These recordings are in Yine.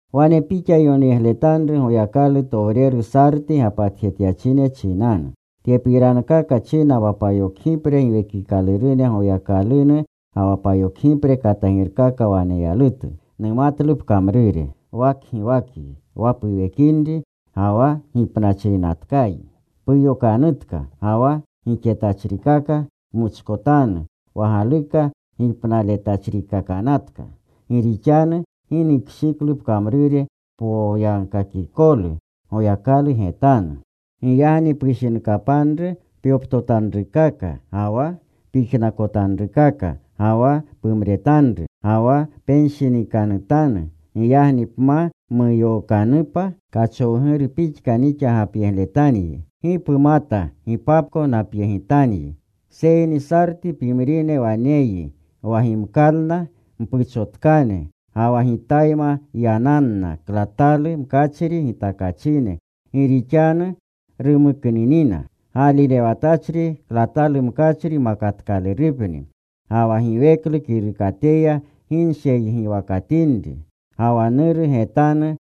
“Wane pixa yonyegletanru Goyakalutowreru Sarti gapatjetyachine chinanu: Tyepirankaka china wa payokgipre giwekikalurune Goyakalunu ga wa payokgipre katagirkaka waneyalutu. Numatlu pkamrure. Wa kgiwakyi. Wa puwekinri, ga wa gipnachrinatkayi. Puyokanutka, ga wa gixetachrikaka pmuchkotanu wa galuka gipnaletachrikakanatka. Gi rixanu gi nukshiklu pkamrure poyagkakikolu Noyakalute getanu. Giyagni pushinkapanru pyoptotanrukaka ga wa pyijnakotanrukaka ga wa pumretanru. Ga wa penshinikanutanu. Giyagni pma muyookanupa, kachowguru pixka nixa gapyegletanyi. Gi pumata gipapko napyegitanyi. Seyni Sarti pimrine waneyyi, wa gimkalna mpuchotkane. Ga wa Gitayma yananna klatalu mkachri gitakachine, gi rixanu rumuknunina. Gaalirewatachri klatalu mkachri makatkalurupni. Ga wa giweklu kirukateya gi nsheygiwakatinri. Ga wa Nuru getanu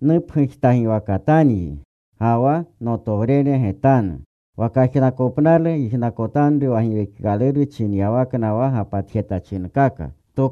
nupgujtagiwakatanyi, ga wa Nurutowrene getanu. Wa kajnakopnalu yijnakotanru wa Giwekikaluru chinyawakna wa gapatjetachinkaka.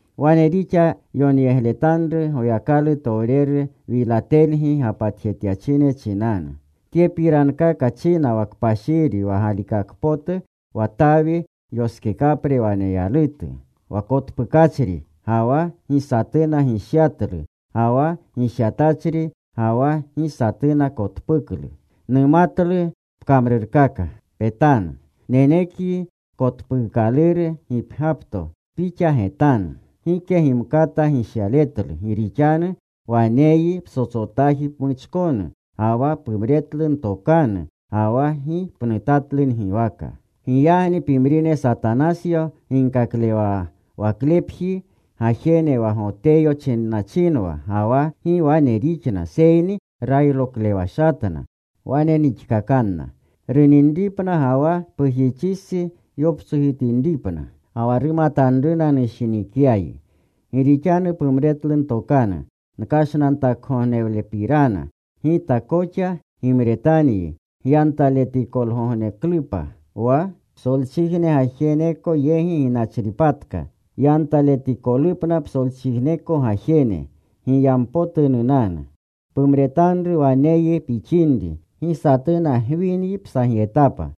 “Wane pixa yonyegletanru Goyakalutowreru Wilatelgi gapatjetyachine chinanu: Tyepirankaka china wa kpashiri, wa galikakpotu, wa Tawi yoskekapre waneyalutu, wa kotpukachri ga wa gi satuna gishyatlu, ga wa gishyatachri ga wa gi satuna kotpuklu. Numatlu pkamrurkaka. Petanu. Nenekyi kotpuukaluru gipgyapto pixa getanu. Gike gimkata gishyaletlu. Gi rixanu waneyyi ptsotsotaji pmuchkonu. Ga wa pumretlu ntokanu. Ga wa gi pnutatlu ngiwaka. Giyagni pimrine Satanasyo ginkaklewaklepji gajene wa Goteyo chinnachinwa ga wa gi wane rixna, seyni rayroklewashatna, wane nixkakanna: runinripna ga wa pujixistsi yoptsojitinripna. Ga wa rumatanruna nushinikyayi. Gi rixanu pumretlu ntokanu nkashnantakgognewlepirana, Gita koxa gimretanyi gyantaletikolgogneklupa, wa psolchijne gajeneko yegi ginachripatka, yantaletikolupna psolchijneko gajene. Giyampotu nunanu. Pumretanru waneyyi pixinri. Gi satuna gwinyi psagyetapa.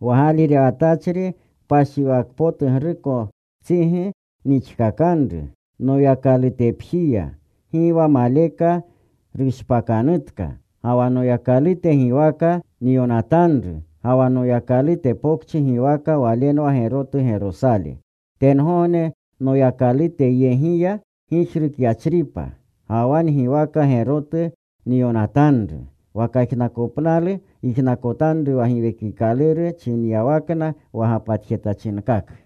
Wa gaalirewatachri kpashiwakpotugrukostsigi nixkakanru Noyakalutepjiya. Gi wa maleka rushpakanutka. Ga wa Noyakalute giwaka nyonatanru, ga wa Noyakalute pokchi giwaka. Walenwa gerotu Gerosale, tengogne Noyakaluteyegiya gijrukyachripa. Ga wa ngiwaka gerotu nyonatanru. Wa kajnakopnalu yijnakotanru wa Giwekikaluru chinyawakna wa gapatjetachinkaka.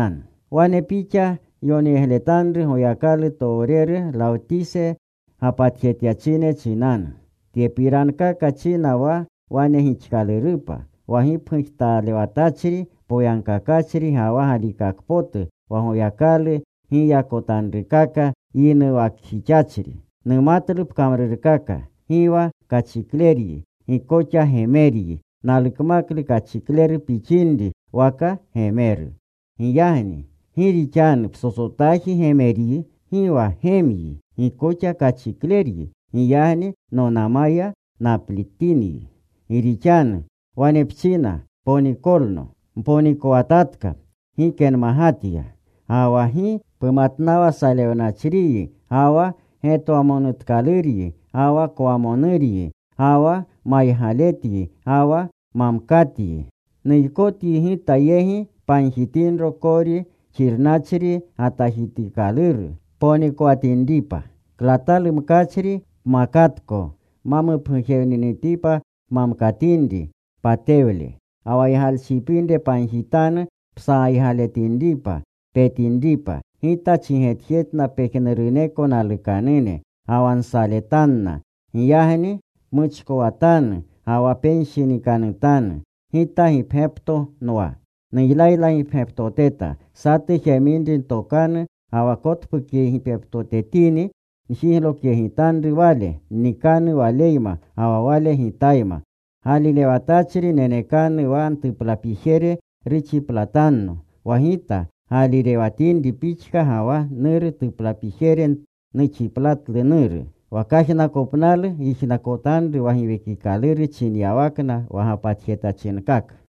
“Wane pixa yonyegletanru Goyakalutowreru Lawtisi gapatjetyachine chinanu: Tyepirankaka china wa Wane gixkalurupa, wa gipgujtalewatachri poyagkakachri ga wa galikakpotu, wa Goyakalu giyakotanrukaka yinuwakjixachri. Numatlu pkamrurkaka, gi wa kachikleryi, gi koxa gemeryi. Nalukmaklu kachikleru pixinri waka gemeru. Giyagni gi rixanu psotsotaji gemeryi. Gi wa gemyi. Gi koxa kachikleryi. Giyagni nonama naplitinyi. Gi rixanu wane pchina, ‘Ponikolno. Nponikowatatka. Gike nmagatya.’ Ga wa gi pumatnawa salewnachriyi, ga wa getwamonutkaluryi, ga wa kwamonuryi, ga wa maygaletyi, ga wa mamkatyi. Nuykotyi Gita yegi pagjitinro kori xirnachri gatajitikaluru ponikowatinripa, klatalu mkachri pmakatko ma mupgujewninitipa pmamkatinri patewle. Ga wa ygalchipinre pagjitanu psagaygaletinripa. Petinripa. Gita chigetjetna pejnuruneko nalukanune, ga wa nsaletanna. Giyagni pmuchkowatanu ga wa penshinikanutanu. Gita gipgyapto nwa. Nuylaylagipgyaptoteta. Satu jeminri ntokanu ga wa kotpukgipgyaptotetini, njiglokyegitanru wale. Nnikanu waleyma ga wa wale Gitayma. Gaalirewatachri nenekanu wa ntuplapijere ruxiplatanno, wa Gita gaalirewatinri pixka ga wa Nuru tuplapijere nuxiplatlu Nuru. Wa kajnakopnalu yijnakotanru wa Giwekikaluru chinyawakna wa gapatjetachinkaka.”